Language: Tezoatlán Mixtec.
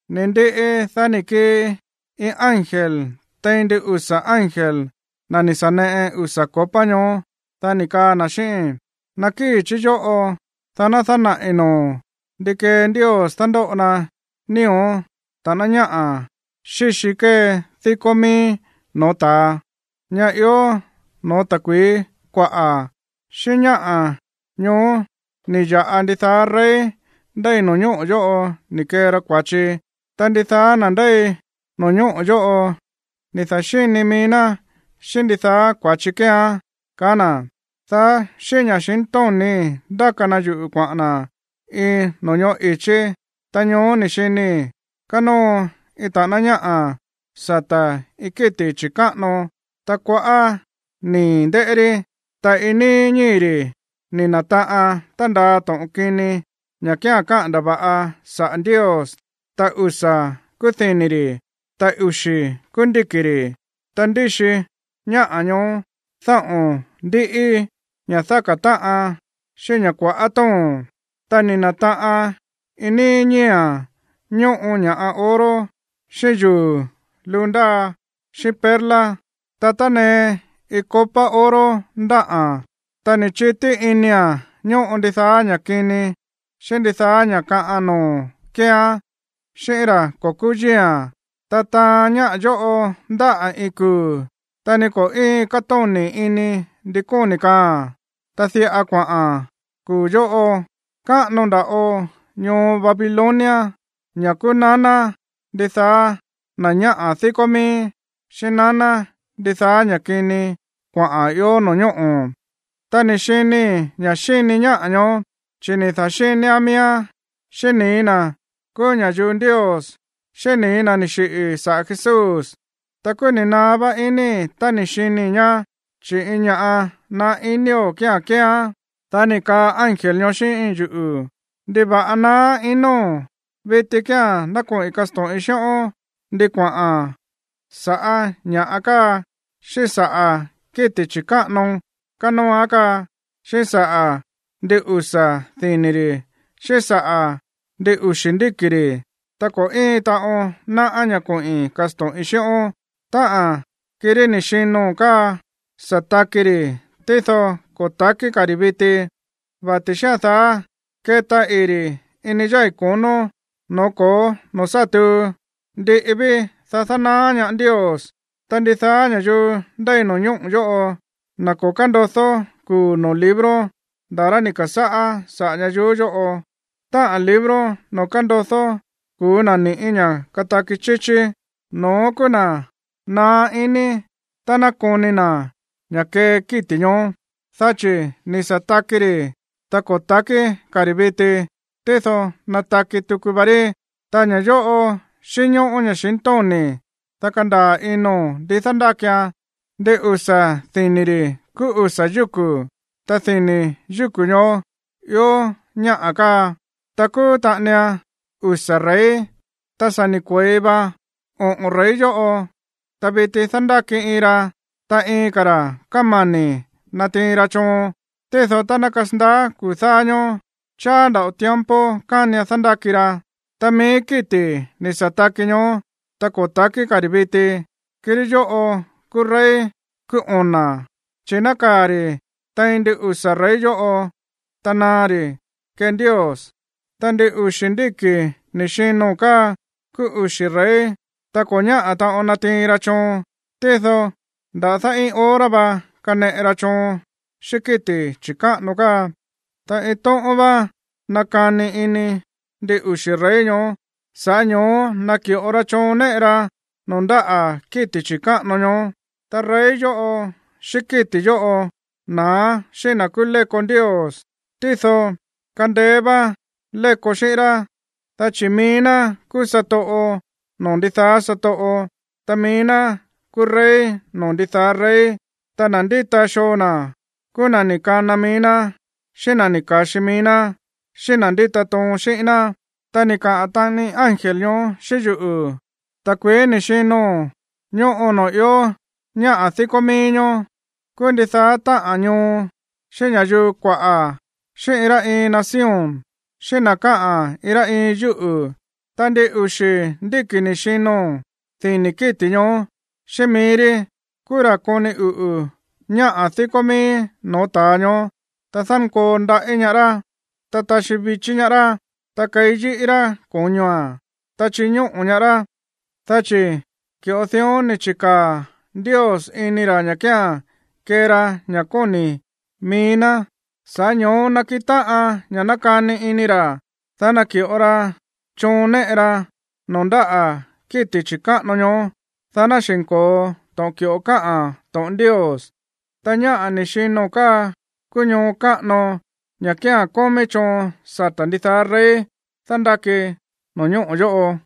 Ni̱ ndiꞌi, dá ni̱ kii iin ángel tein ndin usa̱ ángel, na̱ ni̱ sa̱ neꞌe usa̱ copa ñoó, dá ni̱ kaa na̱ xíꞌíín: ―Nakíi̱ chí yóꞌo, dá ná dánaꞌi̱ noo̱o̱n ndí kee Ndios dándóꞌo na nío̱ ta̱ꞌáná ñáꞌa̱ xíxi kée díkó mií no̱ó ta̱a, ñá ió no̱ó ta̱kui̱í kuaꞌa̱. Xíꞌín ñáꞌa̱ ñoó ni̱ ya̱ꞌa ndidaá rey ndéi no̱ñóꞌo̱ yóꞌo ni̱ kee ra kua̱chi, ta ndidaá na̱ ndéi no̱ñóꞌo̱ yóꞌo ni̱ da̱xíni mií ná xíꞌín ndidaá kua̱chi kéeán ―kaá na̱. Dá xíꞌín ña̱xintóni̱í ndáka na yuꞌu̱ kuaꞌa̱n na̱ iin no̱ñóꞌo̱ i̱chí. Ta ñoó ni̱ xinii̱ kánóo iin ta̱ꞌáná ñáꞌa̱ sata̱ iin kíti̱ chi̱káꞌano, ta kuaꞌá nii̱ ndéꞌé rí, ta iin níí ñíi̱ ri̱ ni̱ na̱taꞌan tándaa to̱ꞌon kini ña̱ kía̱n káꞌa̱n ndava̱ꞌa saꞌa̱ Ndios. Ta usa̱ kúú dini̱ ri̱, ta uxi̱ kúú ndíki̱ ri̱. Ta ndíxi ñáꞌa̱ ñoó dáꞌo̱n ndíꞌí, ña̱ dáka̱ táꞌan xíꞌín ña̱ kua̱ꞌá tóo̱n, ta ni̱ na̱taꞌan iin níí ñíi̱a̱n ñóꞌo ña̱ꞌa oro, xíꞌín yuu̱ luu ndáa xíꞌín perla. Ta tánee iin copa oro ndáꞌa̱n, ta ni̱ chití inia̱n ñóꞌo ndidaá ña̱ kini xíꞌín ndidaá ña̱ kaꞌan noo̱ kéeán xíꞌín ra̱ ko̱ kúú yíi̱a̱n. Ta taan ñáꞌa̱ yóꞌo ndáꞌa̱ iin kuu̱, ta ni ko̱ íin kátóni̱ ini ndi kóni̱ kaaa̱n. Ta diꞌa kuaꞌa̱n kuu̱ yóꞌo: “Káꞌano nda̱ꞌo ñoo Babilonia, ña̱ kúú naná ndidaá na̱ ñáꞌa̱ díkó mií, xíꞌín naná ndidaá ña̱ kini kuaꞌa̱n ió no̱ñóꞌo̱.” Ta ni̱ xinii̱ ña̱ xíni ñáꞌa̱ ñoó, chi̱ ni̱ da̱xínián miíán xíꞌín nii̱ na̱ kúú ña̱yuu Ndios, xíꞌín nii̱ na̱ ni̱ xiꞌi̱ saꞌa̱ Jesús. Ta kúú ni̱ naá vá iníi̱ tá ni̱ xinii̱ ñá, chi̱ iin ña̱ꞌa naá inío̱ kía̱n kéeán. Dá ni̱ kaa ángel ñoó xíꞌín yuꞌu̱: ―¿Ndiva̱ꞌa naá inóo̱n? Viti kía̱n ná koꞌi̱n kasto̱ꞌin xíꞌón ndi kuaꞌa̱n sa̱ꞌá ñáꞌa̱ káa, xíꞌín saꞌa̱ kíti̱ chi̱káꞌano kánóoán káa, xíꞌín saꞌa̱ ndin usa̱ dini̱ ri̱ xíꞌín saꞌa̱ ndin uxi̱ ndíki̱ ri̱. Ta ko̱ íin taꞌon náꞌá ña̱ koꞌi̱n kasto̱ꞌin xíꞌón. Táꞌa̱n kirí ni̱ xino̱n káa sa̱ taki ri̱, tído ko̱ takí ka̱ ri̱ viti. Vati̱ xía̱n daá, keta ii̱ ri̱ ini yái̱ konó, no̱ó ko̱ó noo̱ sá tuu. Ndiꞌi ví, dá dánaá ñaá Ndios. Ta ndidaá ña̱yuu ndéi no̱ñóꞌo̱ yóꞌo, na̱ ko̱ kándodó kuu̱ noo̱ libro nda̱ rá ni̱ ka̱sáꞌá saꞌa̱ ñayuú yóꞌo, táꞌa̱n libro noo̱ kándodó kuu̱ na̱ ni̱ꞌí ña̱ kataki chíchí, no̱ón kúú na̱ naá iní tá ná koni na̱ ña̱ kee kíti̱ ñoó, dá chi̱ ni̱ sa̱ taki ri̱, ta ko̱ takí ka̱ ri̱ viti, tído nataki tuku va rí. ’Ta ña̱ yóꞌo xínñóꞌó ña̱xintóni̱, dá kandaa̱ ino̱n ndi dándákian. Ndin usa̱ dini̱ ri̱ kúú usa̱ yúku̱, ta dini̱ yúku̱ ñoó ió ñáꞌa̱ káa. Ta kúú taꞌanian usa̱ rey. Ta sa̱ ni̱ kue̱i va oꞌo̱n rey yóꞌo, ta viti dándáki iin ra, ta iin ka̱ ra̱ kámani̱ natiin ra choon. Tído tá ná kasandaá kuu̱ dáá ñóó, cháá nda̱ꞌo tiempo kánian dándáki ra. Ta mií kíti̱ ni̱ sa̱ taki ñoó, ta ko̱ takí ka̱ ri̱ viti, kirí yóꞌo̱ kúú rey kúú ona̱, chi̱ nákaa̱ ri̱ tein ndin usa̱ rey yóꞌo, ta naá ri̱ kee Ndios. ’Ta ndin uxi̱ ndíki̱ ni̱ xino̱n káa kúú uxi̱ rey, ta ko̱ ñáꞌa̱ taꞌon natiin ra choon. Tído nda̱dá iin hora va kaneꞌe ra choon xíꞌín kíti̱ chi̱káꞌano káa. Ta iin tóꞌón vá nakani ini ndin uxi̱ rey ñoó, sa̱ꞌá ño̱ó naki̱ꞌo ra choon néꞌe ra noo̱ ndáꞌa̱ kíti̱ chi̱káꞌano ñoó. Ta rey yóꞌo xíꞌín kíti̱ yóꞌo na̱á xíꞌín na̱ kúú léko Ndios, tído kandeé vá léko xíꞌín rá, dá chi̱ mií ná kúú satoꞌo noo̱ ndidaá satoꞌo, ta mií ná kúú rey noo̱ ndidaá rey. Ta na̱ ndíta xoo na̱ kúú na̱ ni̱ kana mií ná xíꞌín na̱ ni̱ ka̱xi mií ná, xíꞌín na̱ ndíta toon xíꞌín ná. Ta ni̱ kaa taꞌani ángel ñoó xíꞌín yuꞌu̱: ―Ta̱kui̱í ni̱ xino̱n ñóꞌo noo̱ ió ñáꞌa̱ díkó mií ñoó, kúú ndidaá táꞌa̱n ñoo, xíꞌín ña̱yuu kuaꞌa̱, xíꞌín iin rá iin nación, xíꞌín na̱ káꞌa̱n iin rá iin yúꞌu̱. Ta ndin uxi̱ ndíki̱ ni̱ xino̱n dini̱ kíti̱ ñoó, xíꞌín mií rí kúú ra̱ koni uꞌu̱ ñáꞌa̱ díkó mií no̱ó ta̱a ñoó, ta dánkoo ndaꞌí ñaá rá, ta taxí vichí ñaá rá, ta keí yi̱ꞌí ra̱ ko̱ñoa̱n, ta chiñóꞌo̱ ñaá rá. Dá chi̱ ki̱ꞌo dión ni̱ chi̱káa̱ Ndios ini ra̱ ña̱ kía̱n kee ra ña̱ kóni̱ mií ná. Sa̱ꞌá ño̱ó nakiꞌin táꞌan ña̱ nakani ini ra̱, dá naki̱ꞌo ra choon néꞌe ra noo̱ ndáꞌa̱ kíti̱ chi̱káꞌano ñoó, dá ná xi̱nko̱o to̱ꞌon ki̱ꞌo káꞌa̱n to̱ꞌon Ndios. Ta ñáꞌa̱ ni̱ xino̱n káa kúú ñoo káꞌano, ña̱ kía̱n kómí choon sata̱ ndidaá rey dándáki no̱ñóꞌo̱ yóꞌo.